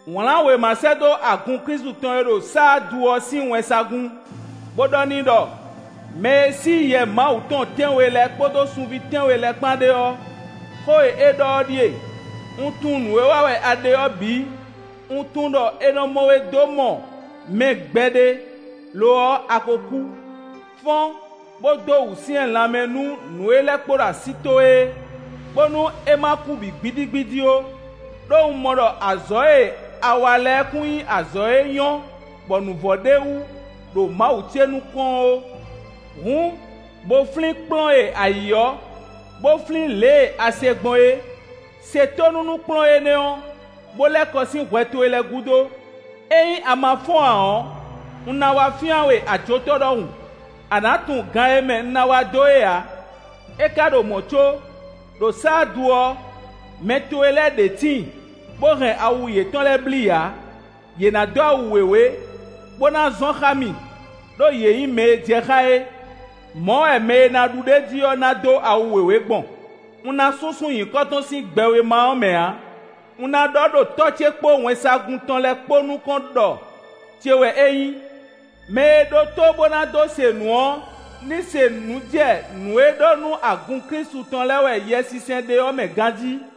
Wlǎn wěma sɛ́ dó agun Klísu tɔn e ɖo Saadu ɔ́ sín wɛnsagun, bó ɖɔ n'i ɖɔ: “Mɛ e sí yɛ Mawu tɔn tɛ́nwe lɛ́ɛ kpódó sunví tɛ́nwe lɛ́ɛ kpán ɖe ɔ́, xó e é ɖɔ ɔ́ ɖíe: Un tunwun nǔ e wa wɛ a ɖe ɔ́ bǐ; un tunwun ɖɔ è nɔ mɔ we dó mɔ mɛ gbɛɖe; lo ɔ́, a ko kú. Fɔ́n, bó dó wǔsyɛ́n lanmɛ nú nǔ e lɛ́ kpo ɖo así towe é, bónú é ma kú bǐ gbídígbídí ó, ɖó un mɔ ɖɔ azɔ̌ e a wa lɛ́ɛ kún nyí azɔ̌ e nyɔ́ bɔ nǔ vɔ ɖ'é wú ɖo Mawu ce nukɔn ɔ́ ó. Hǔn, bó flín kplɔ́n e a yǐ ɔ́, bó flín lě e a se gbɔn é; se tónú nú kplɔ́n énɛ́ ɔ́, bó lɛ́ kɔ sín hwɛ towe lɛ́ɛ gúdo. Ényí a ma fɔ́n ǎ ɔ́, un ná wá fyán we ajotɔ́ ɖɔhun, a nǎ tunwun gan e mɛ un ná wá dó é ǎ. É ka ɖo mɔ̌ có, ɖo Saadu ɔ́, mɛ towe lɛ́ɛ ɖě tíin, bó hɛn awu yětɔn lɛ́ɛ blí ǎ. Yě ná dó awu wěwé, bó ná zɔn xá mì, ɖó yě nyí mɛ e jɛ xá é. “Mɔ̌ wɛ mɛ e ná ɖu ɖ'é jí ɔ́ ná dó awu wěwé gbɔn; un ná súnsún nyǐkɔ tɔn sín gbɛwéma ɔ́ mɛ ǎ. Un ná ɖɔ ɖo Tɔ́ ce kpó wɛnsagun tɔn lɛ́ɛ kpó nukɔn ɖɔ ce wɛ é nyí. “Mɛ e ɖó tó bó ná dó se nǔ ɔ́, ní se nǔ jɛ nǔ e ɖɔ nú agun Klísu tɔn lɛ́ɛ wɛ Yɛsinsɛn ɖe ɔ́ mɛ ganjí!”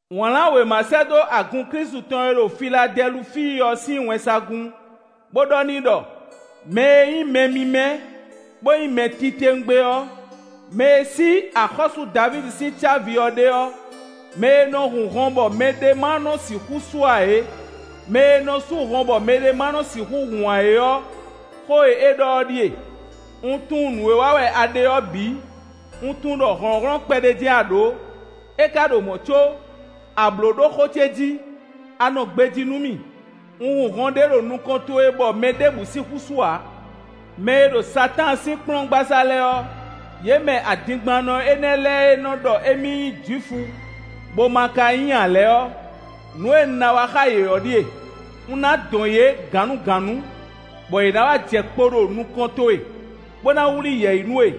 “Wlǎn wěma sɛ́ dó agun Klísu tɔn e ɖo Filadɛlufíi ɔ́ sín wɛnsagun, bó ɖɔ n'i ɖɔ: “Mɛ e nyí mɛ mímɛ́, bó nyí mɛ titewungbe ɔ́, mɛ e sí axɔ́sú Davídi sín cávi ɔ́ ɖe ɔ́, mɛ e nɔ hun hɔn bɔ mɛ ɖěbǔ ma nɔ sixú sú ǎ é, mɛ e nɔ sú hɔn bɔ mɛ ɖěbǔ ma nɔ sixú hun ǎ é ɔ́, xó e é ɖɔ ɔ́ ɖíe: Un tunwun nǔ e wa wɛ a ɖe ɔ́ bǐ; un tunwun ɖɔ hlɔ̌nhlɔ́n kpɛɖé jɛ́n a ɖǒ; é ka ɖo mɔ̌ có, a blǒ ɖó xó ce jí; a nɔ gbejí nú mì; un hun hɔn ɖé ɖo nukɔn towe bɔ mɛ ɖěbǔ sixú sú ǎ. Mɛ e ɖo Satáan sín kplɔ́ngbasá lɛ́ɛ ɔ́, yě mɛ adingbannɔ énɛ́ lɛ́ɛ e nɔ ɖɔ émí nyí Jwifu, bó ma ka nyí ǎ lɛ́ɛ ɔ́, nǔ e un ná wa xá yě ɔ́ ɖíe: un ná dɔn yě gǎnnugǎnnu, bɔ yě ná wá jɛ kpo ɖo nukɔn towe, bó ná wlí yɛ̌yi nú we.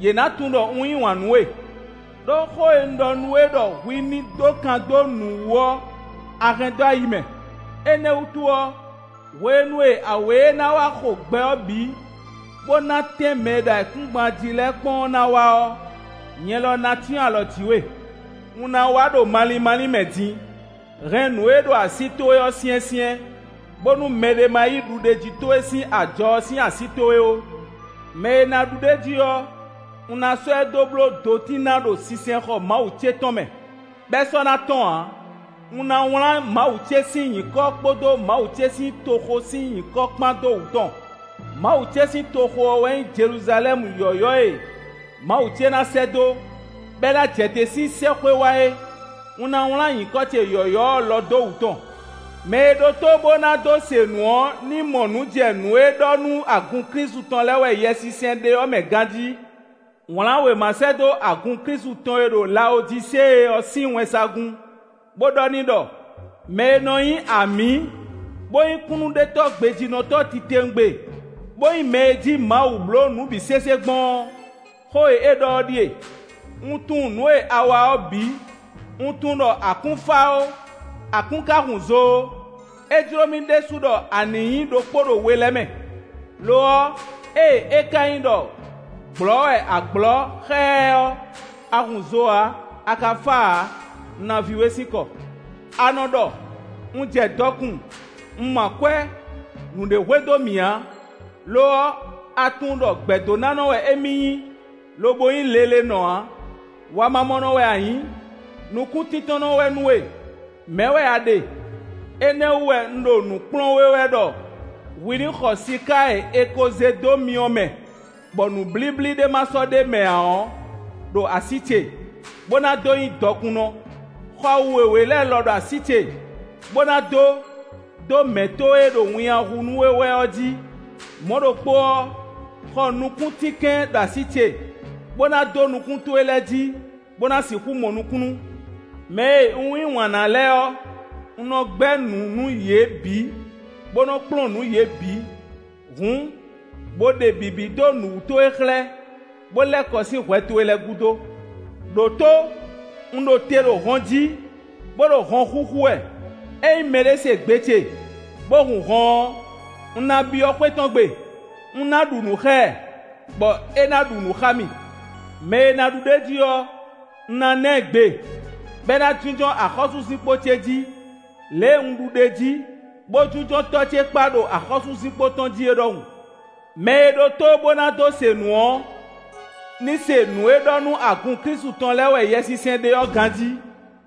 Yě ná tunwun ɖɔ un yí wǎn nú we. Đó xó e un ɖɔ nú we ɖɔ hwi ní ɖó kan dó nǔ wú ɔ́, a hɛn dó ayi mɛ; énɛ́ wútu ɔ́, hwenu e awě e ná wá xo gbɛ ɔ́ bǐ, bó ná tɛ́n mɛ e ɖo ayǐkúngban jí lɛ́ɛ kpɔ́n ɔ́ ná wá ɔ́, nyɛ lɔ ná cyɔ́n alɔ jǐ we. Un ná wá ɖo malín málín mɛ din. Hɛn nǔ e ɖo así towe ɔ́ syɛ́nsyɛ́n, bónú mɛɖé ma yí ɖuɖéjí towe sín ajɔ ɔ́ sín así towe ó. “Mɛ e ná ɖu ɖ'é jí ɔ́, un ná sɔ́ ɛ dó bló dotín ná ɖo sinsɛnxɔ Mawu ce tɔn mɛ, bɔ é sɔ́ ná tɔ́n ǎ. Un ná wlán Mawu ce sín nyǐkɔ kpódó Mawu ce sín toxo sín nyǐkɔ kpán dó wǔ tɔn; Mawu ce sín toxo ɔ́ wɛ nyí Jeluzalɛ́mu yɔ̌yɔ́ e Mawu ce ná sɛ́ dó, bɔ é ná jɛ te sín sɛ́xwé wá é. Un ná wlán nyǐkɔ ce yɔ̌yɔ́ ɔ́ lɔ dó wǔ tɔn. “Mɛ e ɖó tó bó ná dó se nǔ ɔ́ ní mɔ nǔ jɛ nǔ e ɖɔ nú agun Klísu tɔn lɛ́ɛ wɛ Yɛsinsɛn ɖe ɔ́ mɛ ganjí.” “Wlǎn wěma sɛ́ dó agun Klísu tɔn e ɖo Lawodisée ɔ́ sín wɛnsagun, bó ɖɔ n'i ɖɔ: “Mɛ e nɔ nyí Amǐ, bó nyí Kúnnuɖetɔ́ gbejínɔtɔ́ titewungbe, bó nyí mɛ e jí Mawu blǒ nǔ bǐ sésé gbɔn ɔ́, xó e é ɖɔ ɔ́ ɖíe: Un tunwun nǔ e a wa ɔ́ bǐ; un tunwun ɖɔ a kún fá ó, a kún ka hun zo ó; é jló mì ɖésú ɖɔ a nǐ nyí ɖokpó ɖo we lɛ́ɛ mɛ. Lo ɔ́, ée é ka nyí ɖɔ gblɔ̌ wɛ a gblɔ̌ xɛ́ɛ́ ɔ́, a hun zo ǎ, a ka fá ǎ; un ná vi we sín kɔ! A nɔ ɖɔ: ‘Un jɛ dɔkun, un mɔ akwɛ́, nǔɖé hwe dó mì ǎ.’ Lo ɔ́, a tunwun ɖɔ gbɛ̌dónánɔ wɛ émí nyí, lobo nyí lelenɔ ǎ. Wamamɔnɔ wɛ a nyǐ; nukúntíntɔ́nnɔ wɛ nú we; mɛ̌ wɛ a ɖe. Énɛ́ ɔ́ wú wɛ un ɖo nǔ kplɔ́n we wɛ ɖɔ hwi ní xɔ siká e è ko zé dó myɔ mɛ, bɔ nǔblíblí ɖé ma sɔ́ ɖ'é mɛ ǎ ɔ́ ɖo así ce, bó ná dó nyí dɔkunnɔ. Xɔ awu wěwé lɛ́ɛ lɔ ɖo así ce, bó ná dó, dó mɛ̌ towe e ɖo winnyá hu nú we wɛ ɔ́ jí. Mɔ̌ ɖokpó ɔ́, xɔ nukúntínkɛn ɖo así ce, bó ná dó nukún towe lɛ́ɛ jí, bó ná sixú mɔ nukúnnú. Mɛ e un yí wǎn ná lɛ́ɛ ɔ́, un nɔ gbɛ́ nǔ nú yě bǐ, bó nɔ kplɔ́n nǔ yě bǐ. Hǔn, bo ɖe bǐbí dó nǔ wú towe xlɛ́, bó lɛ́ kɔ sín hwɛ towe lɛ́ɛ gúdo. Đǒtó, un ɖo te ɖo hɔn jí, bó ɖo hɔn xúxú wɛ; ényí mɛɖé se gbe ce, bó hun hɔn ɔ́, un ná byɔ́ xwé tɔn gbe; un ná ɖu nǔ xá ɛ, bɔ é ná ɖu nǔ xá mì. “Mɛ e ná ɖu ɖ'é jí ɔ́, un ná ná ɛ gbe, bɔ é ná jínjɔ́n axɔ́súzinkpo ce jí, lě e un ɖu ɖ'é jí, bó jínjɔ́n Tɔ́ ce kpá ɖo axɔ́súzinkpo tɔn jí é ɖɔhun. “Mɛ e ɖó tó bó ná dó se nǔ ɔ́ ní se nǔ e ɖɔ nú agun Klísu tɔn lɛ́ɛ wɛ Yɛsinsɛn ɖe ɔ́ ganjí.”